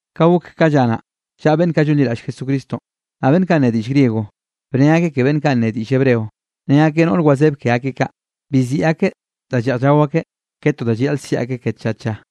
Ka gok ka lla naꞌ, llan beꞌnn kaꞌ llonliraꞌll Jesucristonꞌ, naꞌ beꞌnn kaꞌ nne diꞌll griego, bnne akeꞌ ke beꞌnn kaꞌ nne diꞌll Hebreo. Ne akeꞌ noꞌr wazeb ke akeꞌ kaꞌ, bi ziꞌi akeꞌ da lleꞌj llao akeꞌ ke to da llayaꞌl siꞌi akeꞌ tlla tlla.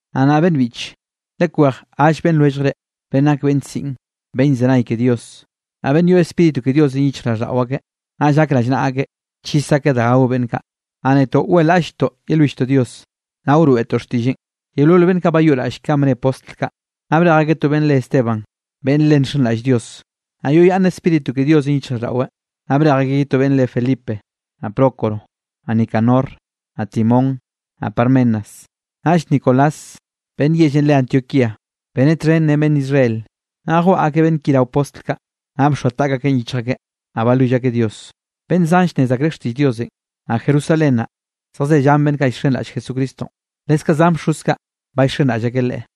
Naꞌ nnaꞌ beꞌnn biꞌche, lekwej gall beꞌnn lwelljre, beꞌnn nak beꞌnn siꞌn, beꞌnn llzenay ke Dios, naꞌ beꞌnn yoꞌ Spíritu ke Diosenꞌ yichjraꞌlldaꞌo akeꞌ, naꞌll gak rallnaꞌa akeꞌ chis akeꞌ danꞌ gao beꞌnn kaꞌ. Naꞌ netoꞌ weꞌlaꞌll-lltoꞌ yelwilltoꞌ Dios, naꞌ wroeꞌtoꞌ xtiꞌlleꞌn. Yeolol beꞌnn kaꞌ bayoꞌraꞌll kanꞌ bne postl kaꞌ, naꞌ brej akeꞌ to beꞌnn re Esteban, beꞌnn le nxenraꞌll Dios, naꞌ yoꞌyaꞌnn Spíritu ke Diosenꞌ yichjraꞌlldaꞌweꞌ. Naꞌ brej akeꞌ ye to beꞌnn re Felipe, naꞌ Prócoro, naꞌ Nicanor, naꞌ Timón, naꞌ Parmenas, naꞌll Nicolás beꞌnn yellenꞌ re Antioquía beneꞌ txhen ren beꞌnn Israel. Naꞌ jwaꞌa akeꞌ beꞌnn ki rao postl kaꞌ, naꞌ bxoa taꞌk akeꞌn yichj akeꞌ, naꞌ balwill akeꞌ Dios. Beꞌnn zan llnnez akreꞌ xtiꞌll Diosenꞌ, naꞌ Jerusalén naꞌ, zejze llan beꞌnn kaꞌ llxenraꞌll Jesucristonꞌ, leskaꞌ zan bxoz kaꞌ, ba llxenraꞌll akeꞌ Leꞌe.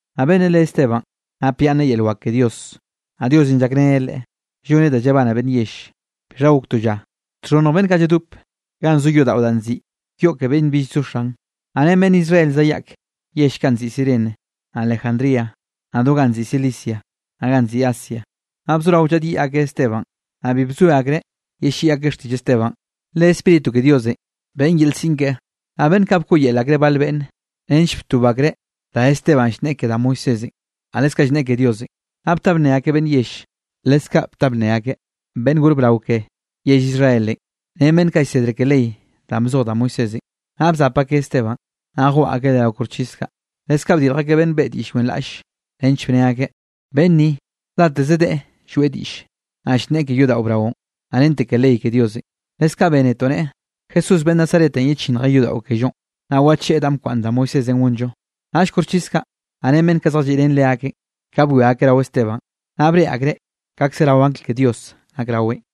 Naꞌ beꞌnnenꞌ re Esteban, napyaꞌnneꞌ yel wak ke Dios, naꞌ Diosenꞌ llakreneꞌ leꞌe lloneꞌ da llabane beꞌnn yell. Bixha gok to lla, txhonnj beꞌnn kaꞌ lladop ganꞌ zo yodaꞌo danꞌ nziꞌi Yoꞌ ke Beꞌnn Bill Zo Xan, naꞌ ren beꞌnn Israel zayaꞌk yell kaꞌ nziꞌi Cirene, naꞌ Alejandría, naꞌ do ganꞌ nziꞌi Cilicia, naꞌ ganꞌ nziꞌi Asia, naꞌ bzorao llaꞌdyiꞌ akeꞌ Esteban. Naꞌ bi llzoe akreꞌ yelliꞌi akeꞌ xtiꞌll Esteban, le Spíritu ke Diosenꞌ beꞌn yel siꞌn keꞌen. Naꞌ beꞌnn kaꞌ bkoꞌyel akreꞌ bal beꞌnn, nench btob akreꞌ, dá Esteban llnneꞌe ke da Moisés, naꞌ leskaꞌ llnneꞌe ke Diosenꞌ. Naꞌ bta bnne akeꞌ beꞌnn yell, leskaꞌ bta bnne akeꞌ beꞌnn gor brao ke yell Israelenꞌ ren beꞌnn kaꞌ llsedre ke ley danꞌ bzoj da Moisésenꞌ, naꞌ bzap akeꞌ Esteban, naꞌ jwaꞌa akeꞌ leꞌe rao koxchis kaꞌ. Leskaꞌ bdirj akeꞌ beꞌnn beꞌe diꞌll wenraꞌll, nench bne akeꞌ: —Beꞌnn ni, dateze deꞌe lloeꞌ diꞌlle, naꞌ llnneꞌe ke yodaꞌo braonꞌ, naꞌ rente ke ley ke Diosenꞌ. Leskaꞌ bénetoꞌ neꞌe, Jesús beꞌnn Nazaretenꞌ yechinnjeꞌ yodaꞌo kellonꞌ, naꞌ wacheꞌe danꞌ bkwaꞌnn da Moisésenꞌ gonllo. Naꞌll koxchis kaꞌ, naꞌ ren beꞌnn kaꞌ zjalliꞌ ren leakeꞌn, ka bwia akeꞌ rao Esteban, naꞌ breꞌe akreꞌ kaꞌkze rao angl ke Dios nak raweꞌn.